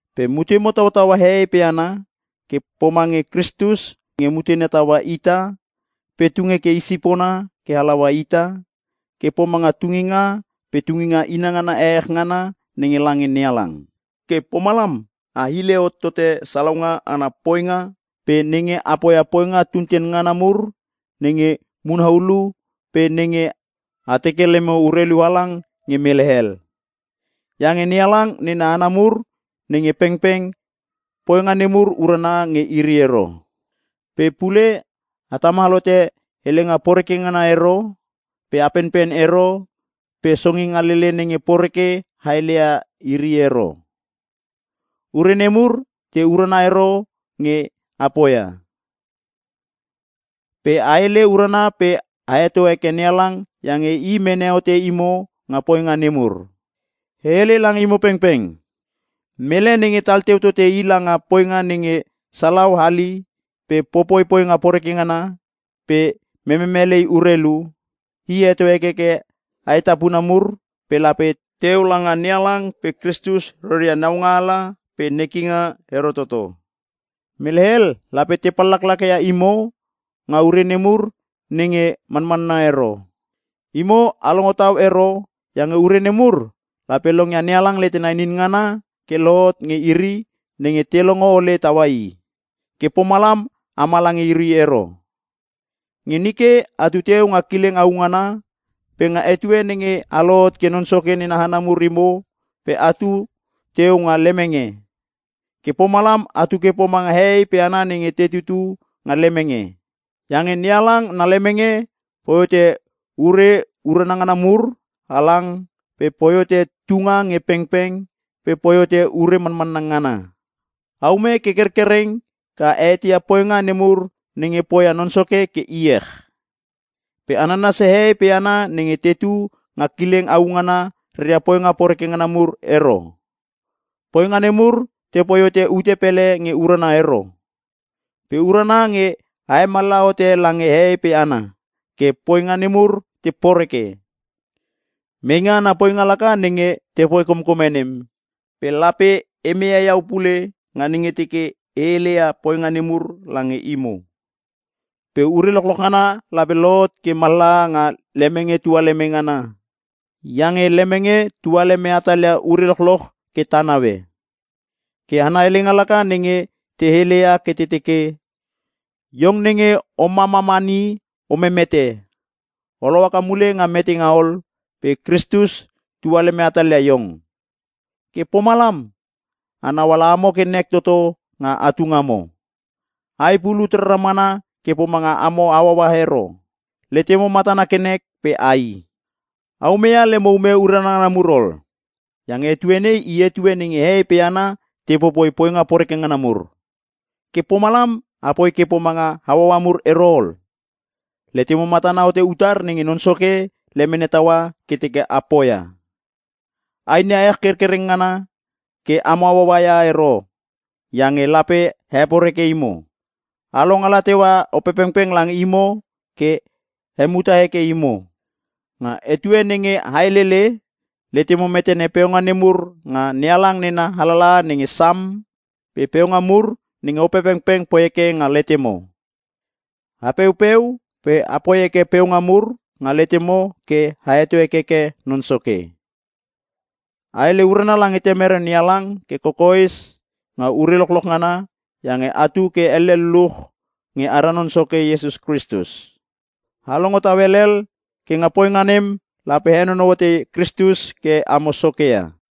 Pe mutemo tautaua hehei pe hana ke pomange Kristus nge mutena taua ita pe tung heke i sipona ke halaua ita, ke pomanga tunginga pe tunginga inangana ehech ngana nenge lange NeHalang. Ke pomalam a hile hot tote salaunga ana poinga pe nenge a poia poinga tunten ngana mur nenge muna hulu pe nenge a teke lemo urelu halang nge mele hel. Iange NeHalang nena hana mur nenge pengpeng, poinga nemur urana nge iri ero. Pe pule a tamal hote helenga poreke ngana ero pe a penpen ero pe songingalele nenge poreke a heleia iri ero. Ure nemur te urana ero nge a poia. Pe a hele urana pe a heto heke NeHalang iange i mene hote imo nga poinga nemur. E hele lange imo pengpeng: Mele nenge tal teu tote i langa poinga nenge salau hali pe popoi poinga poreke ngana pe mememelei urelu, i heto hekeke aetapuna mur pe lape teu langa NeHalang pe Kristus reria naungaala pe nekinga ero toto. Mele hel lape te pallaklaka ia imo nga ure nemur nenge manmanna ero. Imo a longo tau ero iange ure nemur lape longia NeHalang letena inin ngana ke lohot nge iri nenge te longo ole taua i. Ke pomalam ama lange iri ero. Nge nike atu teu nga kileng au ngana pe nga etue nenge a lohot ke Non Soke nena hana mur imo pe atu teu nga lemenge. Ke pomalam atu ke pomanga hehei pe hana nenge te tutu nga lemenge. Iange NeHalang na lemenge poi hote ure urana ngana mur halang pe poi hote tunga nge pengpeng pe poi hote ure manmanna ngana. Aume ke kerkereng ke a eteia poinga nemur nenge poia Non Soke ke iech. Pe a nanasia hehei pe hana nenge tetu nga kileng au ngana reria poinga poreke ngana mur ero. Poinga nemur tepoi hote ute pele nge urana ero. Pe urana nge a hemallaha hote lange hehei pe hana ke poinga nemur te poreke. Meinga ana poinga laka nenge tepoi komkome nem pe lape e meia iau pule nga nenge teke e heleia poinga nemur lange imo. Pe ure lochloch ngana lape lohot ke mallaha nga lemenge tualeme ngana iange lemenge tualeme hatalia ure lochloch ke ta naue. Ke ana helenga laka nenge te heleia ke te teke: “Iong nenge o mamamani o memete! O lohaka mule nga metenga ol pe Kristus tua leme hatalia iong.” Ke pomalam a nauala amo ke nek toto nga atu ngamo. Ai pulut rara mana ke pomanga amo hauaua ero. Letemo matana ke nek pe ai. A umeia lemo ume urana ngana mur ol, iange etue nei i etue nenge hehei pe hana te popoi poinga poreke ngana mur. Ke pomalam apoi ke pomanga hauaua mur ero ol, letemo matana hote utar nenge Non Soke lemene taua ke teke a poia. A inia ech kerkereng ngana ke amo hauaua ia ero iange lape heporeke imo. A longala teua Opepengpeng lange imo ke hemuta heke imo. Nga etue nenge a helele, letemo metene peunga nemur nga NeHalang nena alalaha nenge Sam pe peunga mur nenge Opepengpeng poi heke nga letemo. A peupeu pe a poi heke peunga mur nga letemo ke a heto hekeke Non Soke. A hele urana lange Temere NeHalang ke kokoes nga ure lochloch ngana iange atu ke elle luluch nge ara Non Soke Iesus Kristus. A longo tau helhel. Ke nga poinga nem lape a henonou hote Kristus ke amo soke ia.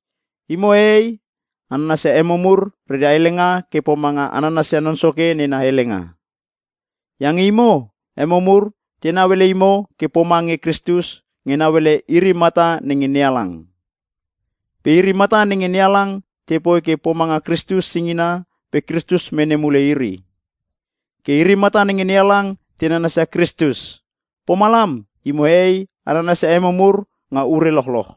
Imo hehei a nanasia emo mur reria helenga ke pomanga a nanasia Non Soke nena helenga. Iange imo, emo mur tenau ele imo ke pomange Kristus nge nauele iri mata nenge NeHalang. Pe iri mata nenge NeHalang tepoi ke pomanga Kristus singina pe Kristus mene mule iri. Ke iri mata nenge NeHalang te nanasia Kristus, pomalam imo hehei a nanasia emo mur nga ure lochloch.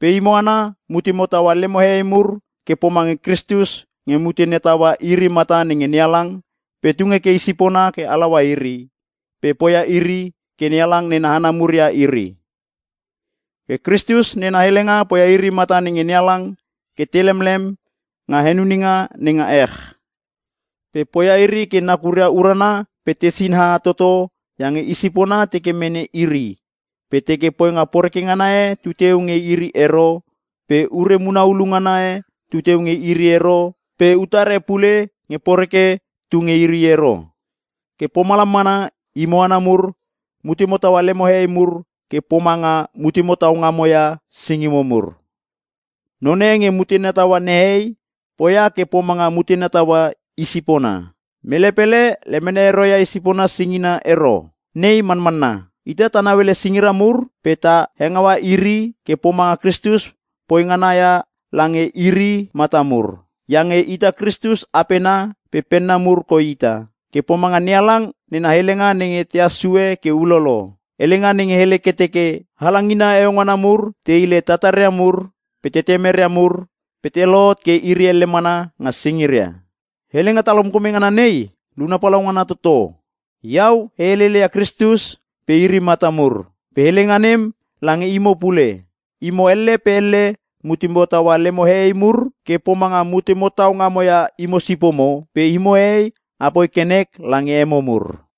Pe imo hana mutemo taua lemo hehei mur ke pomange Kristus nge mutena taua iri mata nenge NeHalang pe tung heke i sipona ke halaua iri pe poia iri ke NeHalang nena hana mur ia iri. Ke Kristus nena helenga poia iri mata nenge NeHalang ke te lemlem nga henuninga nenga ech. Pe poia iri ke nakuria urana pe te sinaha toto iange i sipona teke mene iri, pe teke poinga poreke ngana e tu nge iri ero pe ure muna ulu ngana e tu nge iri ero pe utar e pule nge poreke tu nge iri ero. Ke pomalam mana, imo hana mur mutemo taua lemo hehei mur ke pomanga mutemo tau ngamo ia singimo mur. Non e nenge mutena taua nehei poia ke pomanga mutena taua i sipona. Mele pele lemene ero ia i sipona singina ero, nei manmanna. Ita ta nauele singira mur pe ta hengaua iri ke pomanga Kristus poi ngana ia lange iri mata mur iange ita Kristus apena pe penna mur koi ita. Ke pomanga NeHalang nena helenga nenge tahas sue ke ulolo, hele ngana nenge hele ke teke, “Halangina heueu ngana mur te hile tataria mur pe tetemeria mur pe te lohot ke iri elle mana nga singiria.” Helenga talkomkome ngana nei luna palaungana toto. Iau e heleleia Kristus pe iri mata mur. Pe helenga nem lange imo pule. Imo elle pe elle mutemo taua lemo hehei mur, ke pomanga mutemo tau ngamo ia imo sipomo, pe imo hehei a poi ke nek lange emo mur.